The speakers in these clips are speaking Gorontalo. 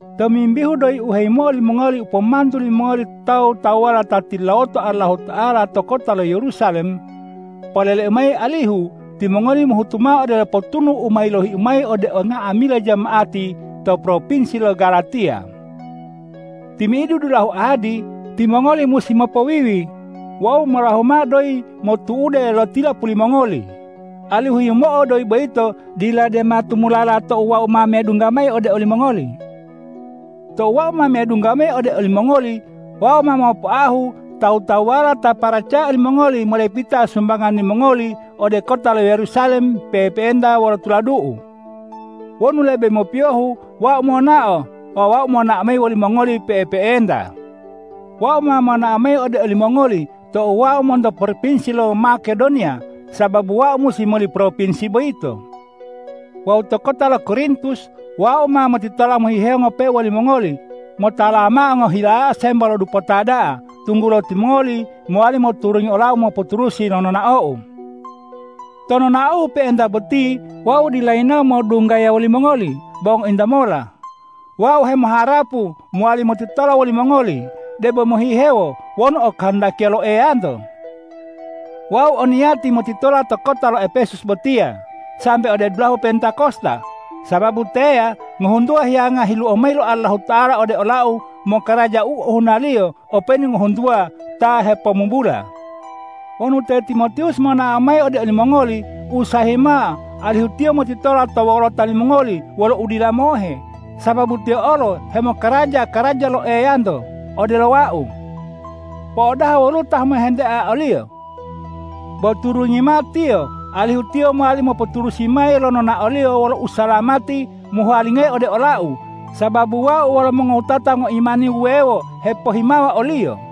Tomimbihu doyi u heyimo'o limongoli u pomantu limongoli tawu-tawuwala ta tilulawoto Allahuta'ala to kota lo Yerusalem, poleleu mayi alihu timongoli mohutu mao odelo potunu u ma yilohiu mayi ode nga'amila jama'ati to propinsi lo Galatiya. Timi'idu dulahu ahadi timongoli musi mopowiwi wawu molahu mao doyi motu'ude lo tilapuli mongoli, alihu yimo'o doyi boyito dila dema tumulala tou wau ma medungga mayi ode olimongoli. Tou wau ma medungga mayi ode olimongoli, wau ma mopoahu tawu-tawuwala ta paracaya limongoli modepita sumbangan limongoli ode kota lo Yerusalem pe'epe'enta wolo tuladu'u. Wonu lebe mopiyohu wau monao, wau ma monao wolimongoliyo pe'epe'enta. Wau ma monao mayi ode olimongoli tou wau ma monto propinsi lo Makedoniya, sababu wau musi moli propinsi boyito. Wawu to kota lo Korintus wau ma motitola mohihewo ngope'e wolimongoli motalawa mao ngohilayao sembo lo dupota da'a, tunggulo timongoli mowali moturungi olau mopoturusi lo nonaou. To nonaou pe'enta boti wau dila yinawo modunggaya wolimongoli bo ngointa mola. Wau hemoharapu mowali motitola wolimongoli debo mohihewo, wonu okahandakiya lo Eyanto. Wau o niyati motitola to kota lo Epesus botiya sambe ode dulahu Pentakosta, sababu teya ngohuntuwa hiyanga hiluo mayi lo Allahuta'ala ode olau mokaraja u ohunaliyo openu ngohuntuwa ta hepomubula. Wonu te Timotiwus monao mayi ode olimongoli, usahayi mao alihu tiyo motitola to wolota limongoli wolo udila mohe, sababu tiyo olo hemokaraja karaja lo Eyanto odelo wau. Po'odaha woluwo ta mohentea oliyo! Bo turungi mao tiyo alihu tiyo mowali mopoturusi mayi lo nonaoliyo wolo usalamati mohuwalingayi ode olau, sababu wau wolo mongowutata ngoimani wuwewo hepohimawa oliyo.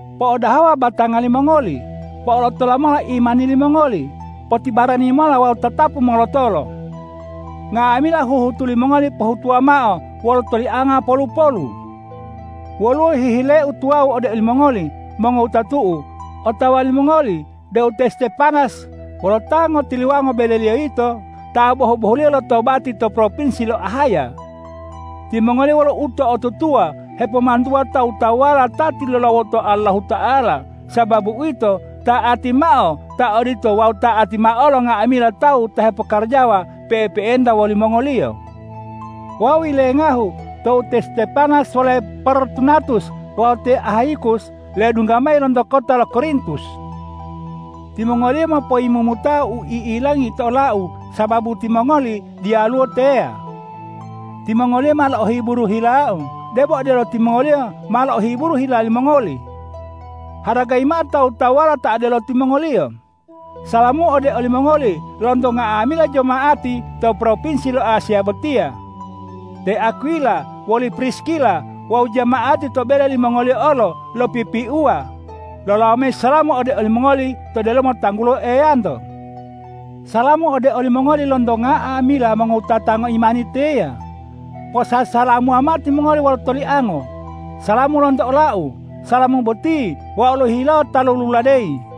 Po'odahawa batanga limongoli. Po'olotola mola imani limongoli. Potibarani mola wawu tatapu molotolo. Nga'amila huhutu limongoli pohutuwa mao wolo tolianga polu-polu. Woluwo hihileu tuwawu ode olimongoli, mongowutatu'u. Otawa limongoli deu te Stepanas wolo ta ngotiluwango beleliyo yito ta bohu-bohuliyo lotobati to propinsi lo Ahaya. Timongoliyo wolo uto'otutuwa hepomantuwa tawu-tawuwala ta tilulawoto Allahuta'ala. Sababu uwito, ta'ati mao ta odito wawu ta'ati mao olo nga'amila tawu ta hepokarajawa pe'epe'enta wolimongoliyo. Wau yilengahu tou te Stepanas wole Portunatus wawu te Ahayikus ledungga mayi lonto kota lo Korintus. Timongoliyo mopoyimumutao u i'ilangi to olau sababu timongoli diyaluwo teya. Timongoliyo ma lo'ohiburu hilau debo odelo timongoliyo ma lo'ohiburu hila limongoli. Haragayi mao tawu-tawuwala ta odelo timongoliyo! Salamu ode olimongoli lonto nga'amila jama'ati to propinsi lo Asiya botiya. Te Akwila woli Priskila wawu jama'ati to bele limongoliyo olo lopipiuwa lolawo mayi salamu ode olimongoli to delomo tanggulo Eyanto. Salamu ode olimongoli lonto nga'amila mongowutata ngoimani teya. Posasalamuwa mao timongoli wolo toliango. Salamu lonto olau. Salamu boti wau lohihilawo ta loluladeyi.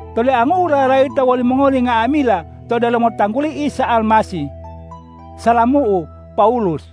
Toliangu'u lalayita wolimongoli nga'amila to delomo tangguli Isa Almasih. Salamu'u, Pawulus